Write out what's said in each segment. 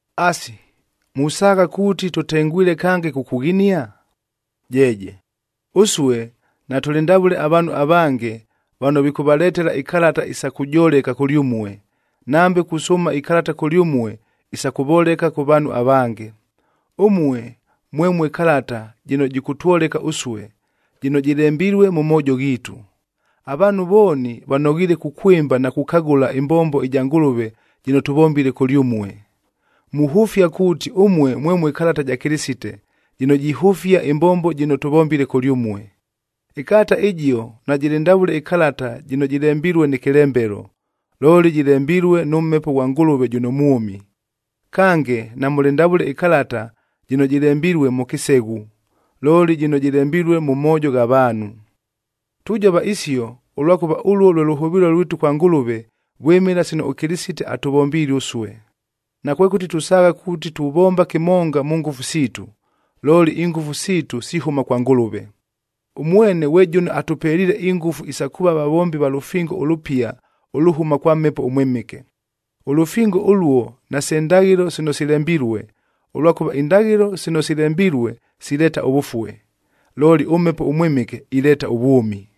Asi, musaagha kuuti tʉtengwile kange kukughinia? Jeeje, ʉsue natʉlɨ ndavʉle avaanhu avange vano vikʉvaletela ikalata isa kujoleka kʉlyʉmue, nambe kusʉʉma ikalata kʉlyʉmue isa kʉvoleka kʉ vaanhu avange. Ʉmue mwemue kalata jɨno jɨkʉtwoleka ʉsue, jɨno jɨlembilue mʉ moojo ghiitu. Avaanhu vooni vanoghiile kukwɨmba na kukagʉla ɨmbombo ɨja Ngʉlʉve jɨno tʉvombile kʉlyʉmue. Muhʉfia kuuti ʉmue mwemue kalata ja Kɨlɨsite, jɨno jihʉfia ɨmbombo jɨno tʉvombile kʉlyʉmue. Ɨkalata ɨjio najɨlɨ ndavʉle ɨkalata jɨno jɨlembilue nɨ kɨlembelo, looli jɨlembilue nʉ Mhepo ghwa Ngʉlʉve jʉno mwʉmi. Kange, namʉlɨ ndavʉle ɨkalata jɨno jɨlembilue mʉ kɨseghu, looli jɨno jɨlembilue mʉ moojo gha vaanhu. Tujova isio, ʉlwakʉva ʉluo lwe lʉhʉvɨɨlo lwitu kwa Ngʉlʉve, vwɨmɨla sino ʉKɨlɨsite atʉvombiile ʉsue. Nakwekʉti tusaagha kuuti tuvomba kɨmonga mʉ ngʉfu siitu, looli ingʉfu siitu sihʉma kwa Ngʉlʉve. Ʉmwene ghwe jʉno atʉpeliile ingʉfu isa kuuva vavombi va lʉfingo ʉlʉpiaa ʉlʉhʉma kwa Mhepo ʉMwɨmɨke. Ʉlʉfingo ʉluo nase ndaghɨlo sino silembilue, ʉlwakʉva indaghɨlo sino silembilue sileeta ʉvʉfue, looli ʉMhepo ʉMwɨmɨke ileeta ʉvwʉmi.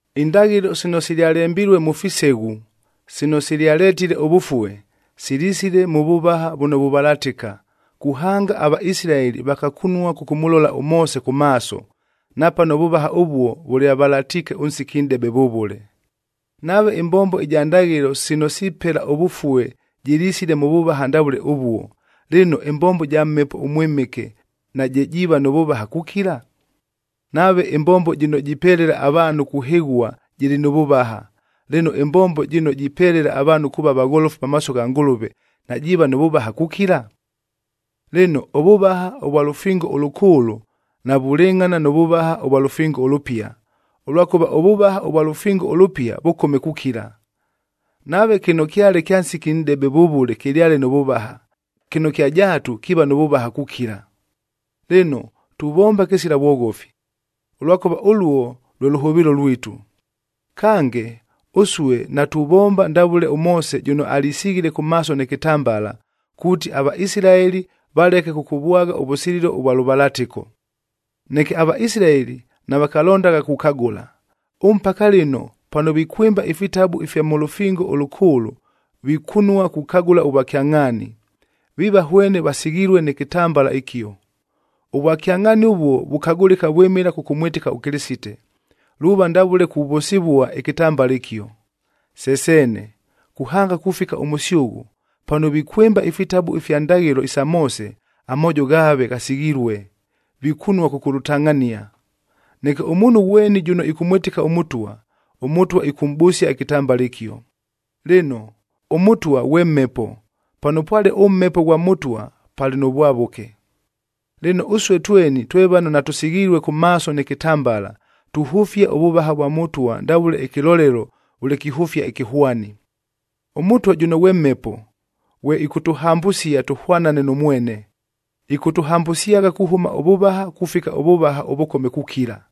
Indaghɨlo sino silyalembilue mʉ fiseghu, sino silyaletile ʉvʉfue, silisile mʉ vʉvaha vʉno vuvalatɨka, kuhanga aVaisilaeli vakakunua kʉkʉmʉlola ʉMoose kʉ maaso, napano ʉvʉvaha ʉvuo vʉlyavalatiike ʉnsiki nʼdebe vʉvʉle.b Nave ɨmbombo ɨja ndaghɨlo sino sipela ʉvʉfue jɨlisile mʉ vʉvaha ndavʉle ʉvuo, lɨno ɨmbombo ɨja Mhepo ʉMwɨmɨke naje jiiva nʉ vʉvaha kukila? Nave ɨmbombo jɨno jipelela avaanhu kuhɨghua jɨlɨ nʉ vʉvaha, lɨno ɨmbombo jɨno jipelela avaanhu kuuva vagholofu pamaaso gha Ngʉlʉve najiiva nʉ vʉvaha kukila? Lɨno, ʉvʉvaha ʉvwa lʉfingo ʉlʉkʉʉlʉ navulɨngʼhana nʉ vʉvaha ʉvwa lʉfingo ʉlʉpia, ʉlwakʉva ʉvʉvaha ʉvwa lʉfingo ʉlʉpia vʉkome kukila. Nave kɨno kyale kya nsiki nʼdebe vʉvʉle kɨlyale nʉ vʉvaha, kɨno kya jaatu kiiva nʉ vʉvaha kukila. Lɨno, tuvomba kɨsila vwoghofi, ʉlwakʉva ʉluo lwe lʉhʉvɨɨlo lwitu. Kange, ʉsue natuvomba ndavʉle ʉMoose jʉno alisighile kʉ maaso nɨ kɨtambala, kuuti aVaisilaeli valeke kʉkʉvwagha ʉvʉsililo ʉvwa lʉvalatɨko. Neke aVaisilaeli navakalondagha kukagʉla. Ʉmpaka lɨno pano vikwɨmba ifitabu ifya mʉ Lʉfingo ʉLʉkʉʉlʉ, vikunua kukagʉla ʉvwakyangʼhaani, viiva hwene vasighilue nɨ kɨtambala ɨkio. Ʉvwakyangʼhaani ʉvuo vukagʉlɨka vwɨmɨla kʉkʉmwɨtɨka ʉKɨlɨsite, luuva ndavʉle kuvʉsɨvua ɨkɨtambala ɨkio. Se seene, kuhanga kufika ʉmʉsyʉghʉ, pano vikwɨmba ifitabu ifya ndaghɨlo isa Moose, amoojo ghaave ghasighilue, vikunua kʉkʉlʉtangʼhania. Neke ʉmuunhu ghweni jʉno ɨkʉmwɨtɨka ʉMʉtwa, ʉMʉtwa ɨkʉmʼbʉsia ɨkɨtambala ɨkio. Lɨno, ʉMʉtwa ghwe Mhepo, pano pwale ʉMhepo ghwa Mʉtwa palɨ nʉ vwavʉke. Lɨno, ʉsue tweni twe vano natʉsighilue kʉ maaso nɨ kɨtambala, tuhʉfia ʉvʉvaha vwa Mʉtwa ndavʉle ɨkɨlolelo vʉle kihʉfia ɨkɨhwani. ɄMʉtwa jʉno ghwe Mhepo, ghwe ɨkʉtʉhambʉsia tʉhwanane nʉ mwene. Ɨkʉtʉhambʉsyagha kuhʉma ʉvʉvaha kufika ʉvʉvaha ʉvʉkome kukila.